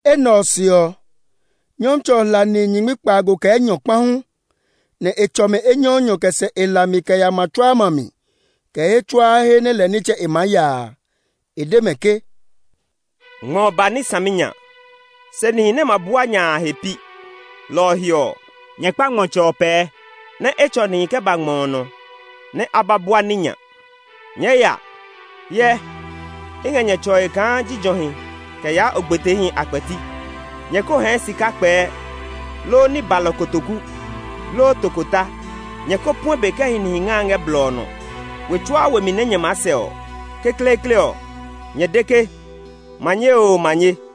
Enɛ ɔ se ɔ, Nyɔmtsɛ ɔ hla nihi nyingmi kpaago kɛ enyɔ Ngmami komɛ deɔ ke “nyingmi kpaago.” kpa hu, nɛ e tsɔ mɛ enyɔɔnyɔ kɛ sɛ e hlami kɛ ya ma tsuaa ma mi, kɛ he tsuaa he nɛ lɛ nitsɛ e maa ya a. E de mɛ ke, “Ngmɔ ɔ ba ní saminya, se nihi nɛ ma bua nya a, a he pi. Lɔ ɔ he ɔ, nyɛ kpa ngmɔtsɛ ɔ pɛɛ, nɛ e tsɔ nihi kɛ ba ngmɔ ɔ nɔ, nɛ a ba bua ní nya. Nyɛɛ ya! Hyɛ, i ngɛ nyɛ tsɔe kaa jijɔhi kɛ yaa ogbeteehi a kpɛti. Nyɛ ko hɛɛ sika kpɛɛ, loo ní balɔ kotoku, loo tokota; nyɛ ko puɛ be kɛ hi nihi ngae ngɛ blɔ ɔ nɔ. We tsuaa we mi nɛ nyɛ maa sɛ ɔ, kekleekle ɔ, nyɛ de ke, ‘Manye oo manye!’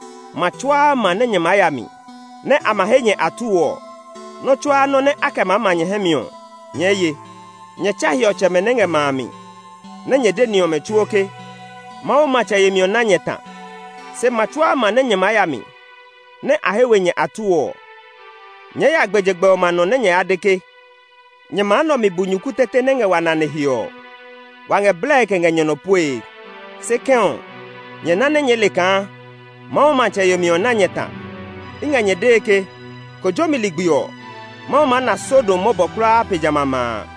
Ma tsuaa ma nɛ nyɛ maa ya mi, nɛ a ma he nyɛ atuu ɔ, nɔ́ tsuaa nɔ́ nɛ a kɛ maa ma nyɛ hɛ mi ɔ, nyɛɛ ye. Nyɛ tsa hiɔtsɛmɛ nɛ ngɛ ma a mi, nɛ nyɛ de ni ɔmɛ tsuo ke, ‘Mawu matsɛ yemi ɔ na nyɛ ta.’ Se ma tsuaa ma nɛ nyɛ maa ya mi, nɛ a he we nyɛ atuu ɔ, nyɛɛ ya gbɛjegbɛ ɔmɛ a nɔ nɛ nyɛ ya de ke, ‘Nyɛ ma nɛ ɔ mi bunyuku tete nɛ ngɛ wa nane he ɔ, wa ngɛ blɛe kɛ ngɛ nyɛ nɔ puee. Se kɛ̃ ɔ, nyɛ na nɛ nyɛɛ le kaa Mawu matsɛ yemi ɔ na nyɛ ta!’ I ngɛ nyɛ dee ke, kojomi ligbi ɔ, Mawu maa na Sodom mɔbɔ kulaa pe jamɛ a ma a!”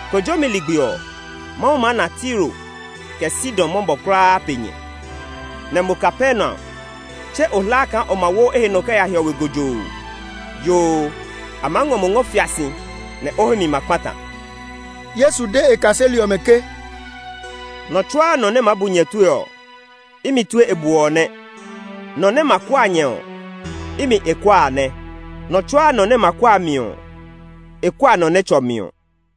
Kojomi ligbi ɔ, Mawu maa na Tiro, kɛ Sidon mɔbɔ kulaa pe nyɛ. Nɛ mo Kapernaum! Tse o hla kaa o ma wo o he nɔ kɛ ya hiɔwe lokoo! Yoo, a maa ngɔ mo ngɔ fia si, nɛ o hɛ mi ma kpata!” Yesu de e kaseli ɔmɛ ke, “Nɔ tsuaa nɔ nɛ maa bu nyɛ tue ɔ, imi tue e bu ɔ nɛ; nɔ nɛ ma kua nyɛ ɔ, imi e kua a nɛ. Nɔ tsuaa nɔ nɛ ma kua mi ɔ, e kua nɔ nɛ tsɔ mi ɔ.”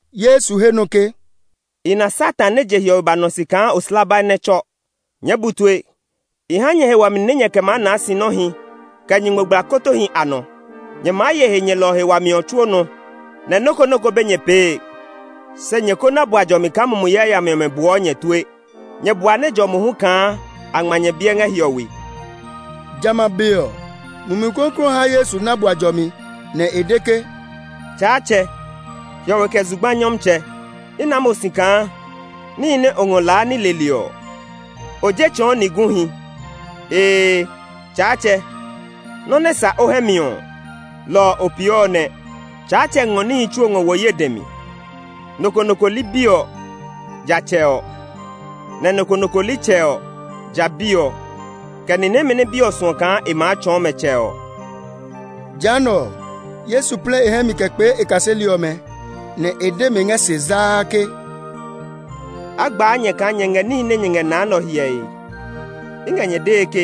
Yesu he nɔ ke, “I na Satan nɛ je hiɔwe ba nɔ si kaa oslabai nɛ tsɔ. Nyɛɛ bu tue! I ha nyɛ he wami nɛ nyɛɛ kɛ maa naa sinɔhi, kɛ nyingmogblakotohi a nɔ. Nyɛ maa ye he nyɛlɔ ɔ he wami ɔ tsuo nɔ, nɛ nɔ́ ko nɔ́ ko be nyɛ pee. Se, nyɛ ko na bua jɔmi kaa mumi yayami ɔmɛ buɔ nyɛ tue; nyɛ bua nɛ jɔ mohu kaa a ngma nyɛ biɛ ngɛ hiɔwe.” Jamɛ a be ɔ, Mumi Klɔuklɔu ɔ ha Yesu na bua jɔmi, nɛ e de ke, “Tsaatsɛ, hiɔwe kɛ zugba Nyɔmtsɛ, i naa mo si kaa níhi nɛ o ngɔ kɛ laa ní leli ɔ, o je tsɔɔ ni guhi. Ee, Tsaatsɛ, nɔ́ nɛ sa o hɛ mi ɔ, lɔ ɔ o pee ɔ nɛ. “Tsaatsɛ ngɔ níhi tsuo ngɔ wo ye dɛ mi. Nɔ ko nɔ ko li Bi ɔ, ja Tsɛ ɔ, nɛ nɔ ko nɔ ko li Tsɛ ɔ, ja Bi ɔ, kɛ ni nɛmɛ nɛ Bi ɔ suɔ kaa e maa tsɔɔ mɛ Tsɛ ɔ.” Jehanɛ ɔ, Yesu plɛ e hɛ mi kɛ kpee e kaseli ɔmɛ, nɛ e de mɛ ngɛ se zaa ke, “A gbaa nyɛ kaa nyɛ ngɛ níhi nɛ nyɛ na nɛ ɔ hyɛe! I ngɛ nyɛ dee ke,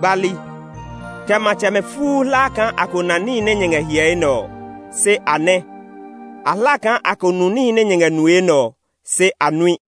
gbali, kɛ matsɛmɛ fuu hla kaa a ko na níhi nɛ nyɛ ngɛ hyɛe nɛ ɔ, se a nɛ; a hla kaa a ko nu níhi nɛ nyɛ ngɛ nue nɛ ɔ, se a nui.”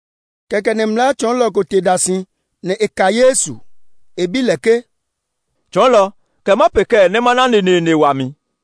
Kɛkɛ nɛ mlaa tsɔɔlɔ ko te da si, nɛ e ka Yesu. E bi lɛ ke, “Tsɔɔlɔ, kɛ ma pee kɛɛ nɛ ma na neneene wami?”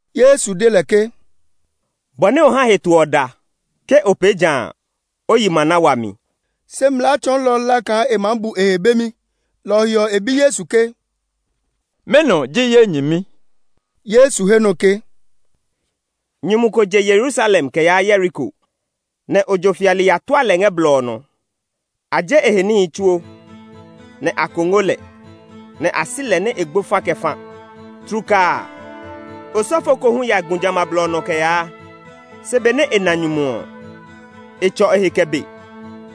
Yesu de lɛ ke, “Bɔ nɛ o ha heto ɔ da; ke o pee ja a, o yi ma na wami.” Se mlaa tsɔɔlɔ ɔ hla kaa e maa bu e he bemi, lɔ ɔ he ɔ, e bi Yesu ke, “Mɛnɔ ji ye nyɛmi?” Yesu he nɔ ke, “Nyumu ko je Yerusalem kɛ yaa Yeriko, nɛ ojo fiali ya tua lɛ ngɛ blɔ ɔ nɔ. A je e he níhi tsuo, nɛ a kongo lɛ, nɛ a si lɛ nɛ e gbo fa kɛ fa. Tlukaa a, osɔfo ko hu ya gu jamɛ a blɔ ɔ nɔ kɛ yaa; se benɛ e na nyumu ɔ, e tsɔ e he kɛ be.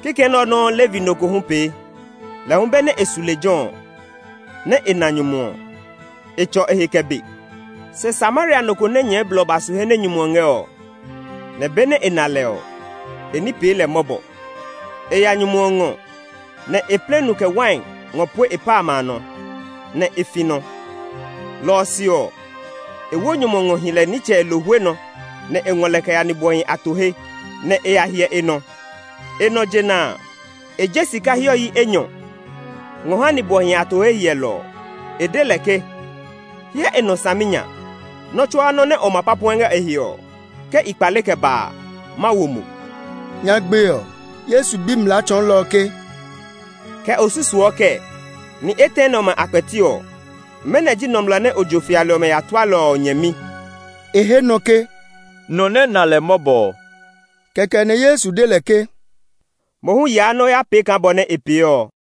Kikɛ nɛ ɔ nɔuu Levi no ko hu pee; lɛ hu benɛ e su lejɛ ɔ, nɛ e na nyumu ɔ, e tsɔ e he kɛ be. Se Samaria no ko nɛ nyɛɛ blɔ ba su he nɛ nyumu ɔ ngɛ ɔ, nɛ benɛ e na lɛ ɔ, e ní pee lɛ mɔbɔ. E ya nyumu ɔ ngɔ, nɛ e plɛ nu kɛ wai ngɔ pue e pa amɛ a nɔ, nɛ e fi nɔ. Lɔ ɔ se ɔ, e wo nyumu ɔ ngɔ hi lɛ nitsɛ e lohwe nɔ, nɛ e ngɔ lɛ kɛ ya nibwɔhi a to he, nɛ e ya hyɛ e nɔ. E nɔ jena a, e je sika hiɔ yi enyɔ ngɔ ha nibwɔhi a to he hyɛlɔ ɔ. E de lɛ ke, ‘Hyɛ e nɔ saminya! Nɔ tsuaa nɔ nɛ o ma pa puɛ ngɛ e he ɔ, ke i kpale kɛ ba a, ma wo mo.’” Nyagbe ɔ, Yesu bi mlaa tsɔɔlɔ ɔ ke, “Kɛ o susuɔ kɛɛ? Ni etɛ nɛ ɔmɛ a kpɛti ɔ, mɛnɔ ji nɔmlɔ nɛ ojo fiali ɔmɛ ya tua lɛ ɔ e nyɛmi?” E he nɔ ke, “Nɔ nɛ na lɛ mɔbɔ ɔ.” Kɛkɛ nɛ Yesu de lɛ ke, “Mo hu yaa nɛ o ya pee kaa bɔ nɛ e pee ɔ.”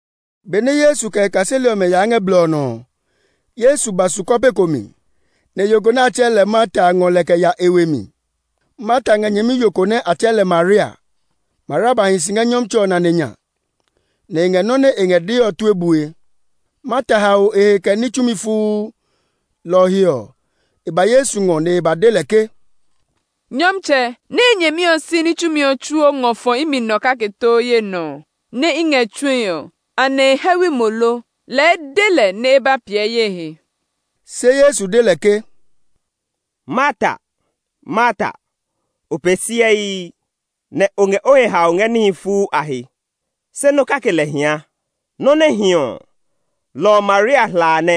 Benɛ Yesu kɛ e kaseli ɔmɛ yaa ngɛ blɔ ɔ nɔ ɔ, Yesu ba su kɔpe ko mi, nɛ yo ko nɛ a tsɛɛ lɛ Marta a ngɔ lɛ kɛ ya e we mi. Marta ngɛ nyɛmiyo ko nɛ a tsɛɛ lɛ Maria. Maria ba hi si ngɛ Nyɔmtsɛ ɔ nane nya, nɛ e ngɛ nɔ́ nɛ e ngɛ dee ɔ tue bue. Marta hao e he kɛ ní tsumi fuu. Lɔ ɔ he ɔ, e ba Yesu ngɔ nɛ e ba de lɛ ke, “Nyɔmtsɛ, nɛ ye nyɛmi ɔ si ní tsumi ɔ tsuo ngɔ fɔ imi nɔ kake too ye nɔ nɛ i ngɛ tsue ɔ, anɛ e hɛwi mo lo? Lɛɛ de lɛ nɛ e ba piɛ ye he.” Se Yesu de lɛ ke, “Marta, O pee siɛii, nɛ o ngɛ o he haoe ngɛ níhi fuu a he, se nɔ́ kake lɛ hia. Nɔ́ nɛ hi ɔ, lɔ ɔ Maria hla a nɛ,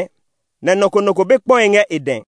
nɛ nɔ ko nɔ ko be kpɔe ngɛ e dɛ.”